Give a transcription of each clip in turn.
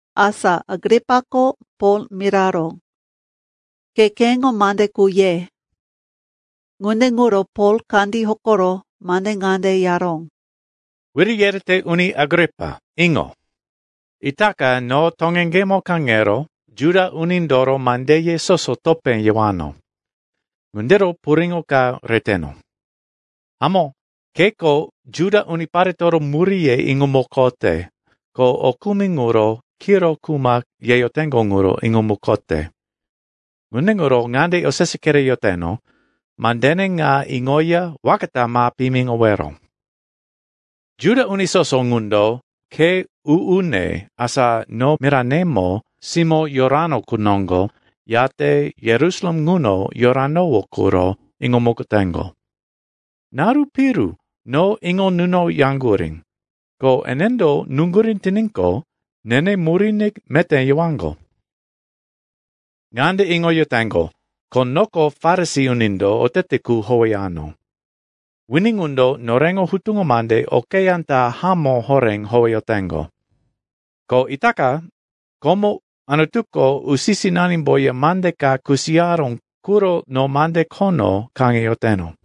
Asa Agripako Pol miraró, “Ke keŋo mande qu ye.” Ŋunde ŋuro Pol kandí hokoro mande ŋande yaró, “Wiri yerete Uni Agripa, iŋo. Itaka no toŋeŋgemo kaŋero Juda unindoro mandeye soso topé yewano. Ŋundiro puriŋo ka reteno. Hamó, keko Juda uniparetoro muríye iŋomukote, ko o kumi ŋuro kiro kuma yeyoteŋgo ŋuro iŋomukote. Ŋunde ŋuro ŋande osese kereyoteno, mandene ŋa iŋoya waka ta ma piyimiŋowero. “Juda uni soso ŋundo khe u-une, asa no miranemo simó yorano qu noŋgo yate Yerusalem ŋuno yoranowó quro iŋomukoteŋgo. Naru piru no iŋo nunoyaŋgurí, ko enendo nuŋgurí tiníqo, nene muríne meté yewaŋgo. Ŋande iŋoyoteŋgo, ko noko Farisi unindo otete qu howeyano. Wini ŋundo noreŋo hutuŋo mande okeyá ta hamó horé howeyoteŋgo. Ko itaka komo Anutuko usi-sinanimboya mande ka kusiyaró quro no mande khono kaŋeyoteno.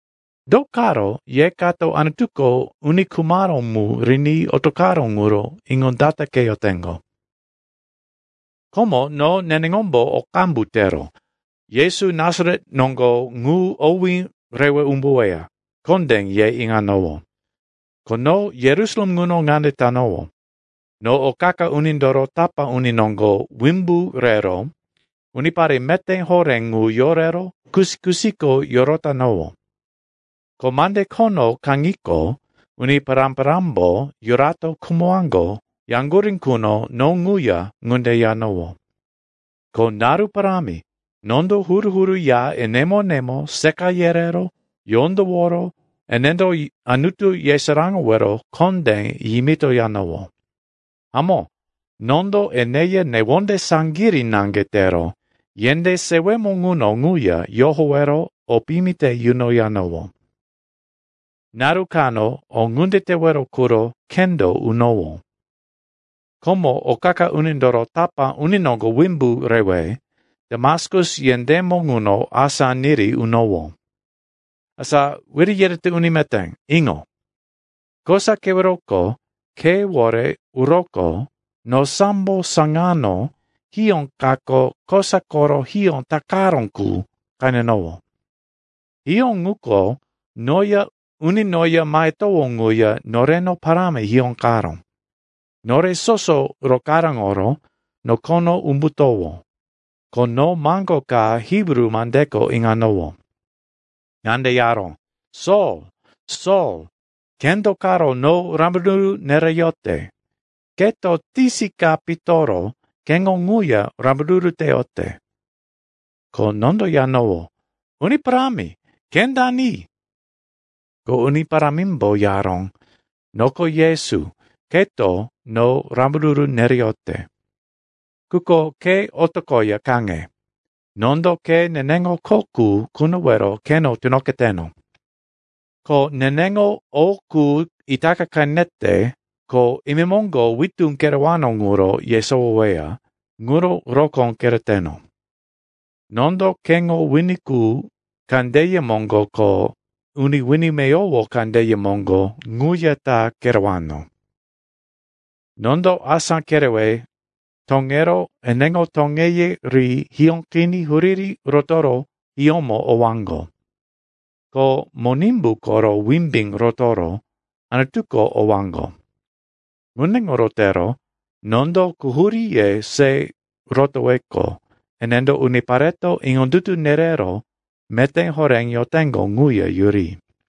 Do karo ye kato Anutuko uni khumaró mu riní otoqaró ŋuro iŋondataqeyoteŋgo? “Komo no neneŋombo o qambu tero, Yesu Nasaret noŋgo ŋu owí rewe umbuweya, kondé ye iŋanowó. Ko no Yerusalem ŋuno ŋunde tanowó. No o qa-qa unindoro tapá uni noŋgo wimbu rero unipare meté horé ŋu yorero kusi-kusiko yorotanowó. Ko mande khono kaŋiqo, uni pará-parámbo, yurato khumowaŋgo, yaŋgurí quno no ŋuya ŋunde yanowó. Ko naru parámi nondo huru-huru ya enemo-enemo seqa yerero yondoworo enendo Anutu yesaráŋowero kondé yimitoyanowó. Hamó, nondo eneya newonde saŋgirí naŋge tero yendé sewemo ŋuno ŋuya yohowero o piyimi te yunoyanowó. “Naru kano o ŋunde tewero quro khendo unowó. Komo o qa-qa unindoro tapá uni noŋgo wimbu rewe Damaskus yendémo ŋuno asá niri unowó. Asa Wiri yerete Uni Meté, iŋo. Kosa keweroko khewore uroqo no sambo saŋano hiyó kako kosa koro hiyó takaró qu qenenowó. Hiyó ŋuko noya uni noya mahetowó ŋuya noreno parámi hiyóqaró. Nore soso rokaráŋoro nokono umbutowó, ko no maŋgo ka Hibru mandeko iŋanowó. Ŋande yaró, ‘Sol, Sol, ke do karo no rambaruru nereyote? Keto tisi ka pitoro keŋo ŋuya rambaruru teyote.’ “Ko nondo yanowó, ‘Uni Parámi, ke dani?’ “Ko Uni Parámimbo yaró, ‘Noko Yesu, keto no rambaruru nereyote. Quko ke otoqoya kaŋe. Nondo ke neneŋo kho qu kunowero keno tunoqeteno. Ko neneŋo o qu itaka qenete ko imemoŋgo witú kerewano ŋuro yesowoweya, ŋuro rokó kereteno. Nondo keŋo wini qu kandeye moŋgo ko uni wini meyowo kandeye moŋgo ŋuya ta kerewano. Nondo asá kerewe toŋero eneŋo toŋeye ri hiyóqiní huriri rotoro hiyómo owaŋgo, ko Monimbu koro wimbí rotoro Anutuko owaŋgo. Ŋunde ŋuro tero nondo quhuríye se rotoweqo, enendo unipareto iŋondutu nerero meté horé yoteŋgo ŋuya yuri.’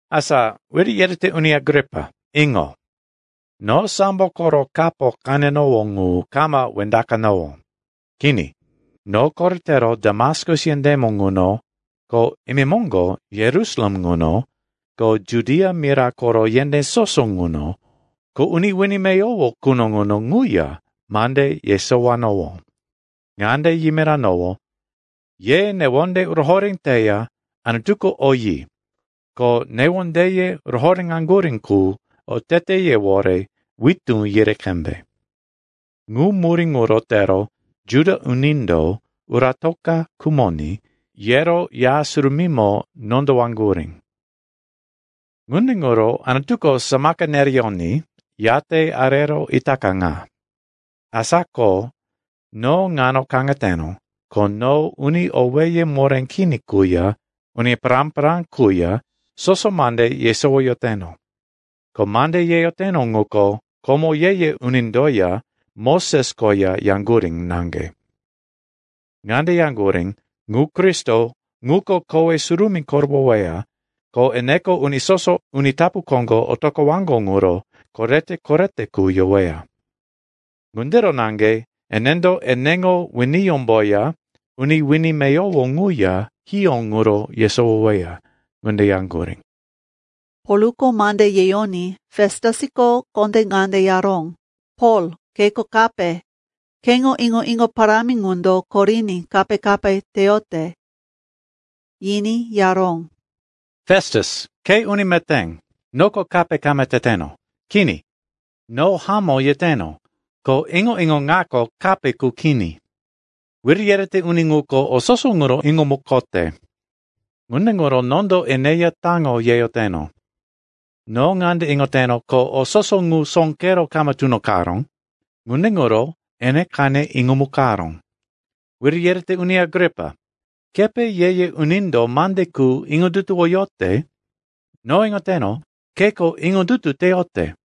“Asa, Wiri yerete Uni Agripa, iŋo. No sambo koro kapo qenenowó ŋu kama wendaqanowó. Kini, no koretero Damaskus yendémo ŋuno, ko imemoŋgo Yerusalem ŋuno, ko Judia mira koro yendé soso ŋuno, ko uni wini meyowo quno ŋuno ŋuya mande yesowanowó. Ŋande yimiranowó, ‘Ye newonde rohoré teya Anutuko oyi, ko newondeye rohoréŋaŋgurí qu oteteyewore witú yiri qembe.’ Ŋu murí ŋuro tero Juda unindo, uratoka khumoní, yero Ya Surumímo nondowaŋgurí. Ŋunde ŋuro Anutuko samaka nereyoní, yate arero itaka ŋa. Asa ko no ŋano kaŋeteno, ko no uni owéye moré kini quya uni pará-pará quya soso mande yesowoyoteno. Ko mande yeyoteno ŋuko komo ye-ye unindoya Moses koya yaŋgurí naŋge. Ŋande yaŋgurí, ‘Ŋu Kristo ŋuko kowe surumí korowoweya, ko eneko uni soso uni tapu koŋgo otoqowaŋgo ŋuro korete-korete qu yoweya. Ŋundiro naŋge enendo eneŋo winiyómboya uni wini meyowo ŋuya hiyó ŋuro yesowoweya,’ ŋunde yaŋgurí.” Polko mande yeyoní Festusko kondé ŋande yaró, “Pol, keko kape! Keŋo iŋo-iŋo parámi ŋundo koriní kape-kape teyote!” Yiní yaró, “Festus, ke uni meté, noko kape kama teteno. Kini. No hamó yeteno, ko iŋo-iŋo ŋako kape qu kini. Wiri yerete uni ŋuko o soso ŋuro iŋomukote. Ŋunde ŋuro nondo eneya taŋo yeyoteno. No ŋande iŋoteno, ko o soso ŋu sóqero kama tunoqaró. Ŋunde ŋuro ene qene iŋomukaró. Wiri yerete Uni Agripa, kepe ye-ye unindo mande qu iŋondutuwoyote? No iŋoteno, keko iŋondutu teyote!”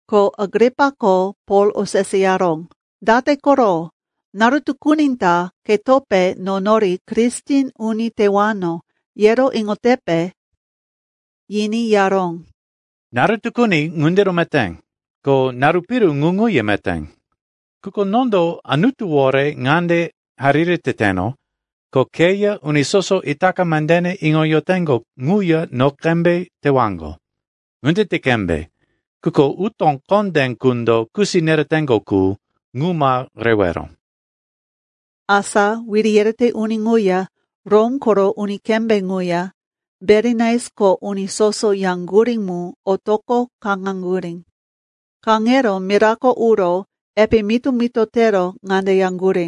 Ko Agripako Pol oseseyaró, “Date koro? Naru tukuni ta ketope no nori Kristen uni tewano, yero iŋotepe?” Yiní yaró, “Naru tukuni ŋundiro meté, ko naru piru ŋu ŋuya meté. Quko nondo Anutuwore ŋande hariri teteno, ko keya uni soso itaka mandene iŋoyoteŋgo ŋuya no qembe tewaŋgo. Ŋunde ti qembe, quko utó kondé qundo kusi nereteŋgo qu, ŋu ma rewero.” Asa wiri yerete uni ŋuya Rom koro uni kembé ŋuya Berinais ko uni soso yaŋgurí mu otoqo kaŋaŋgurí. Kaŋero mirako uro epe mito-mito tero ŋande yaŋgurí,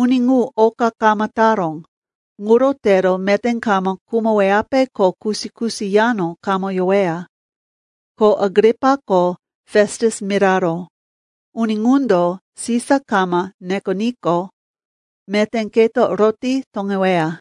“Uni ŋu oka kama taró, ŋuro tero meté kama khumoweyape ko kusi-kusi yano kama yoweya.” Ko Agripako Festus miraró, “Uni ŋundo Sisa kama nekoníqo, meté keto roti toŋeweya.”